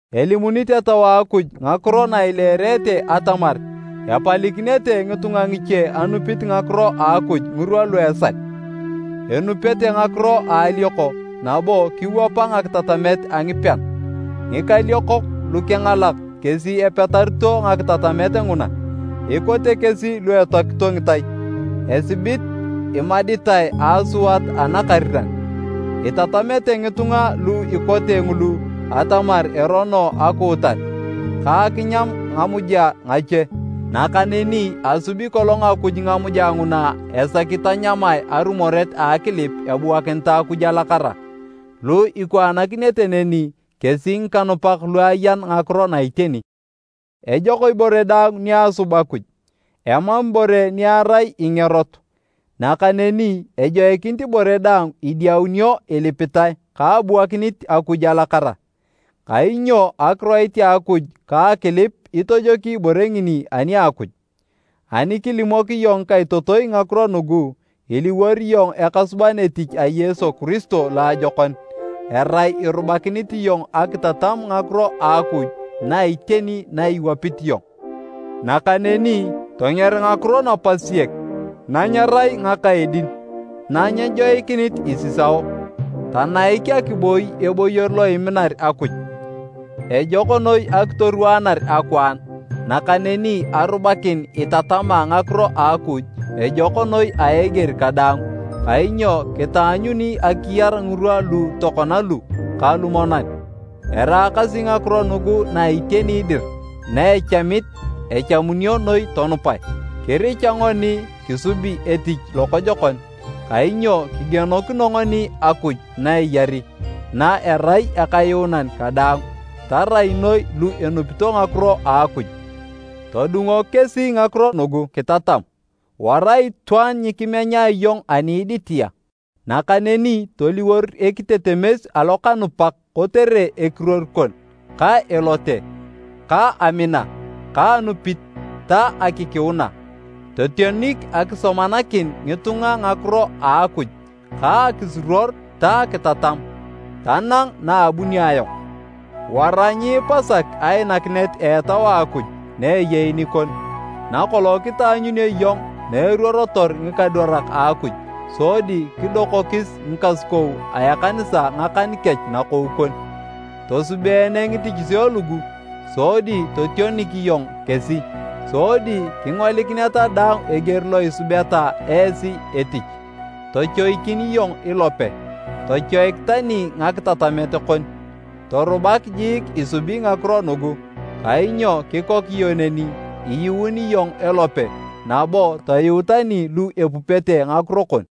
Elimunit Etau a Akuj ngakiro na ileerete atamar epalikinete ngitunga ngiche anupit ngakiro a Akuj ngirwa lu esal. Enupete ngakiro a alioko nabo kiwapa ngakitatamet a ngipean. Ngikaliokok lukengalak kesi epetarito ngakitatamet nguna, ikote kesi lu etoakito ngitai, esibit imaditae a asuat anakariran. Itatamete ngitunga lu ikote ngulu atamar erono akuutar, ka akinyam ngamuja ngache. Nakaneni asubi kolong Akuj ngamuja nguna esaki tanyamae, arumoret a akilip ebuakinitae Akuj alakara. Lu ikwaanakinete neni kesi ngikanupak lu ayan ngakiro na iteni. Ejok ibore daang ni asub Akuj, emam ibore ni erai ingerot, nakaneni ejoikinit ibore daang idiaunio ilipitae ka abuakinit Akuj alakara, kainyo Akiroit a Akuj ka akilip itojoki ibore ngini ani a Akuj. Ani kilimok iyong ngikaitotoi ngakiro nugu, iliwor iyong ekasuban etich a Yesu Kiristo loajokon, erai irubakinit iyong akitatam ngakiro a Akuj na iteni na iwapit iyong. Nakaneni tonger ngakiro napasiek na nyerai ngaka edin, na nyejoikinit isisao. Tanaik akiboi eboyor lo iminar Akuj. Ejok noi akitorwaanar akwaan, nakaneni arubakin itatama ngakiro a Akuj, ejok noi a eger kadaang, kainyo kitaanyuni akiyar ngirwa lu tokona lu ka lumonan. Eraakasi ngakiro nugu na iteni dir na echamit echamunio noi tonupae. Kiricha ngoni kisubi etich lokojokon kainyo kigienokino ngoni Akuj na eyari, na erai Akayuunan kadaang, tarai noi lu enupito ngakiro a Akuj. Todungok kesi ngakiro nugu kitatam. Wara itwaan nyikimenya iyong ani iditia, nakaneni toliwor ekitetemes alokanupak kotere ekiruor kon, ka elote, ka amina, ka anupit ta akikiuna. Totionik akisomanakin ngitunga ngakiro a Akuj ka akisuruor ta akitatam, tanang na abunio ayong. Wara nyiipasak ainakinet a Etau a Akuj na eyei nikon, nakolong kitaanyunio iyong na eruorotor ngikadwarak a Akuj sodi kidokokis ngikasukou a ekanisa ngakan kech nakou kon. Tosubeene ngitichisio lugu sodi totionik iyong kesi, sodi kingolikineta daang eger lo isubeta esi etich. Tochoikin iyong ilope, tochoik tani ngakitatamet kon. Torubak jiik isubi ngakiro nugu kainyo kikok iyong neni, iyuun iyong elope nabo toyuu tani lu epupete ngakiro kon.